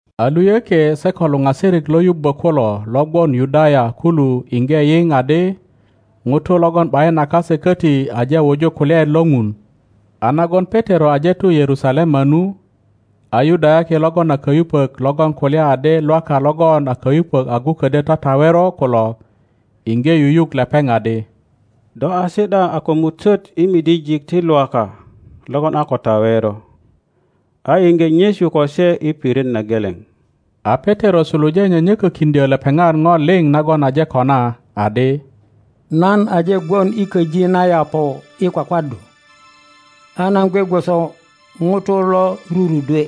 A luyökie se ko luŋasirik lo yubbo kulo lo gwon Yudaya kulu iŋge yiŋ adi ŋutu logon ’bayin a kase koti aje wuju kulyaet lo Ŋun. A nagon Petero aje tu Yerusalema nu, a Yudayaki logon a kayupok logon kulya adi Lwaka logon a kayupök agu ködyö tatawero kulo iŋge yuyuk lepeŋ adi, Do a si ’da a kömutöt i midijik ti Lwaka logon a ko tawero, a iŋge nyesu ko se i pirit na geleŋ. A Petero suluje nyönyokökiŋdyo lepeŋat Ŋo liŋ nagon aje kona, adi, Nan aje gwon i köji na Yaŋo i kwakwaddu, a nan gwe gwoso ŋuto lo rurudwe,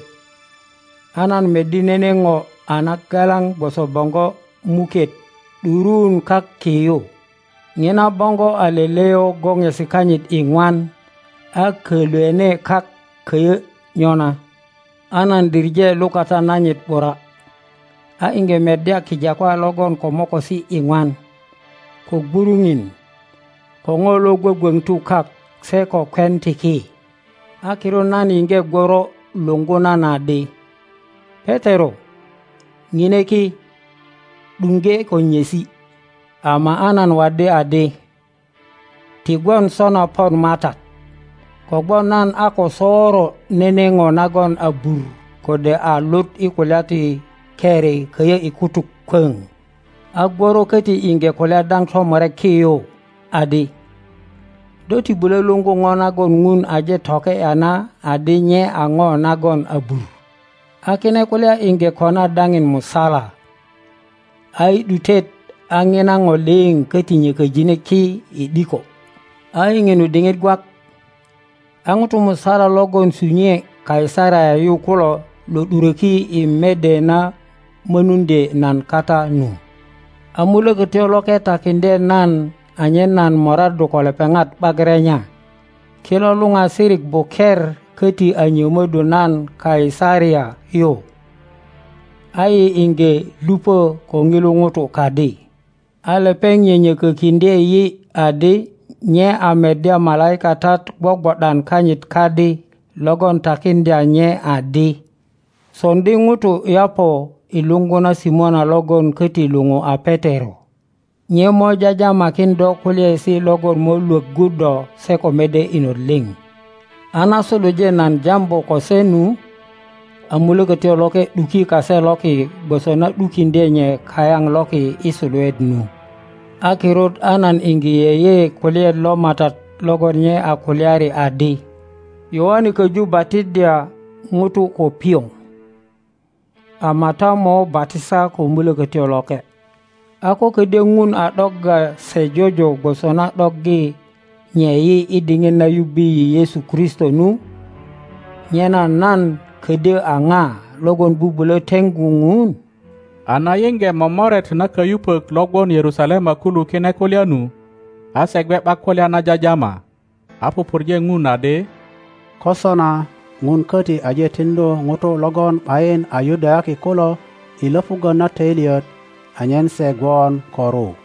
a nan meddi nene ŋo a nagalaŋ gwoso boŋgo muket ’duruun kak ki yu. Ŋina boŋgo a leleyo goŋesi kanyit iŋwan a kölwene kak köyö nyona. A nan diŋe lukata nanyit ’bura, a iŋge meddya kijakwa logon ko mokosi iŋwan, ko gwuruŋin, ko ŋo lo gwögwöŋtu kak se ko kwen ti ki. A kirut nan yiŋge gworo luŋgu nan adi, Petero, ŋine ki, ’duŋge ko nyesi. Ama a nan waddi adi, Ti gwon sona pon Matat; kogwon nan a ko soŋro nene ŋo nagon abur kode a lut i kulya ti keri köyö i kutuk kwöŋ. A gworo köti iŋge kulya dao tomurek ki yu, adi, Do ti bulö luŋgu ŋo nagon Ŋun aje toke ’ya na adi nye a ŋo nagon abur. A kine kulya iŋge kona daŋin musala, a i ’dutet a ŋina ŋo liŋ köti nyököjine ki i ’diko. A i ŋinu diŋit gwak, a ŋutu musala logon sunyue Kaisaria yu kulo lo ’duröki i mede na mönuŋdye nan kata nu. A Mulökötyo Loke takiŋdye nan anyen nan moraddu ko lepeŋat ’bak renya. Kilo luoasirik buker köti a nyömöddu nan Kaisaria yu, a yi iŋge luŋö ko ŋilu ŋuto kadi. A lepeŋ nyönyökökiŋdye yi adi nye a meddya malaikatat gwogwo ’dan kanyit kadi logon takiŋdya nye adi, Soŋdi ŋutu Yaŋo i luŋgu na Simona logon köti luou a Petero. Nye mo jajamakin do kulyaesi logon mo lwöggu do se ko mede inot liŋ. A na suluje nan jambu ko se nu, a Mulökötyo Loke ’duki kase loki gwoso na ’dukiŋdye nye kayaŋ loki i suluet nu. A kirut a nan iŋge yeye kulyaet lo Matat logon nye a kulyari adi, Yoane köju batiddya ŋutu ko pioŋ, ama ta mo batisa ko Mulökötyo Loke. A ko ködyö Ŋun a ’dogga se jojo gwoso na ’doggi nye yi i diŋit na yubbi yi Yesu Kristo nu, nyena nan ködyö a ŋa logon bubulö teŋgu Ŋun? A na yiŋge momoret na kayupök lo gwon Yerusalema kulu kine kulya nu, a se gwe ’bak kulya na jajama, a pupurje Ŋun adi, Ko sona, Ŋun köti aje tiŋdu ŋutu logon ’bayin a Yudayaki kulo i löpuggö na töilyet anyen se gwon ko ru.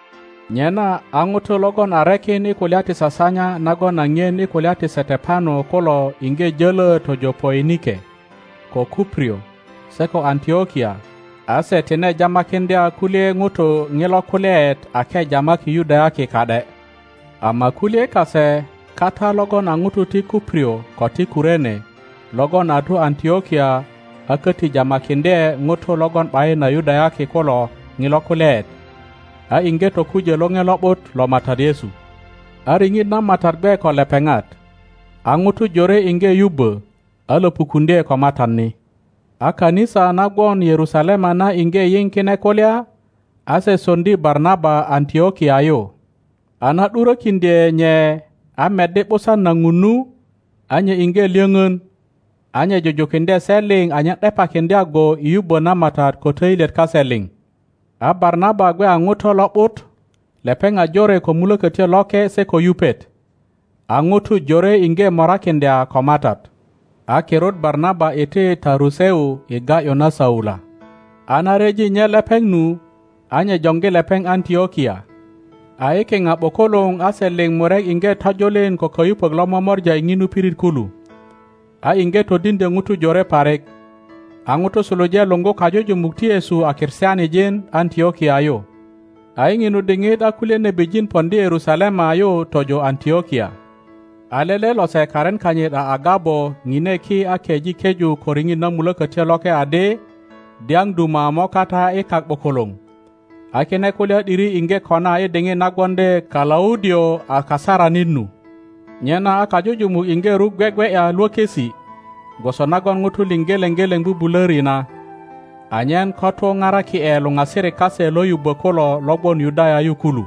Nyena a ŋutu logon a rekin i kulya ti sasanya nagon a ŋien i kulya ti Setepano kulo iŋge jölö tojo Poinike, ko Kuprio, se ko Antlokia, a se tine jamakiŋdya kulye ŋutu ŋilo kulyaet ake jamaki Yudayaki ka ’de. Ama kulye kase kata logon a ŋutu ti Kuprio ko ti Kurene logon a tu Antlokia a köti jamakiŋdye ŋutu logon ’bayin a Yudayaki kulo ŋilo kulyaet, a iŋge tokujö Loŋe Lo ’but lo Matat Yesu. A riŋit na Matat gwe ko lepeŋat, a ŋutu jore iŋge yubbö, a löpukuŋdye ko Matat ni. A kanisa na gwon Yerusalema na iŋge yiŋ kine kulya; a se soŋdi Barnaba Antlokia yu. a na ’durökiŋdye nye a meddi ’busan na Ŋun nu, a nye iŋge lyöŋön; a nye jujukiŋdye se liŋ anyen ’depakiŋdya go i yubbö na Matat ko töilyet kase liŋ. A Barnaba gwe a ŋuto lo ’but, lepeŋ a jore ko Mulökötyo Loke se ko yupet. A ŋutu jore iŋge morakiŋdya ko Matat. A kirut Barnaba iti Taruseu i ga ’yu na Saula. A na ryeji nye lepeŋ nu, a nye joŋgi lepeŋ Antlokia. A i kiŋa ’bukuluŋ a se liŋ murek iŋge tojulin ko kayupök lo momora i ŋinu pirit kulu, a iŋge todiŋdyö ŋutu jore parik. A ŋutu suluje luŋgu kajujumuk ti Yesu a Kristianijin Antlokia yu. A i ŋinu diŋit a kulye nebijin poŋdi Yerusalema yu tojo Antlokia. A lele lose karin kanyit a Agabo ŋine ki a keŋ keju ko riŋit na Mulökötyo Loke adi dyaŋ duma mo kata i kak ’bukuluŋ, a kine kulya ’diri iŋge kona i diŋit na gwoŋdi Kalaudio a kasaranit nu. Nyena a kajujumuk iŋge ruk gwegwe ’ya lwökisi, gwoso nagon ŋutu liŋ geleŋ geleŋ bubulöri na, anyen ko tu paraki ’e luŋasirik kase lo yubbo kulo lo gwon Yudaya yu kulu.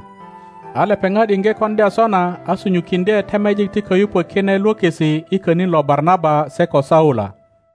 a lepeŋat iŋge koŋdya sona, a sunyukiŋdye temejik ti kayupok kine lwökisi i könin lo Barnaba se ko Saula.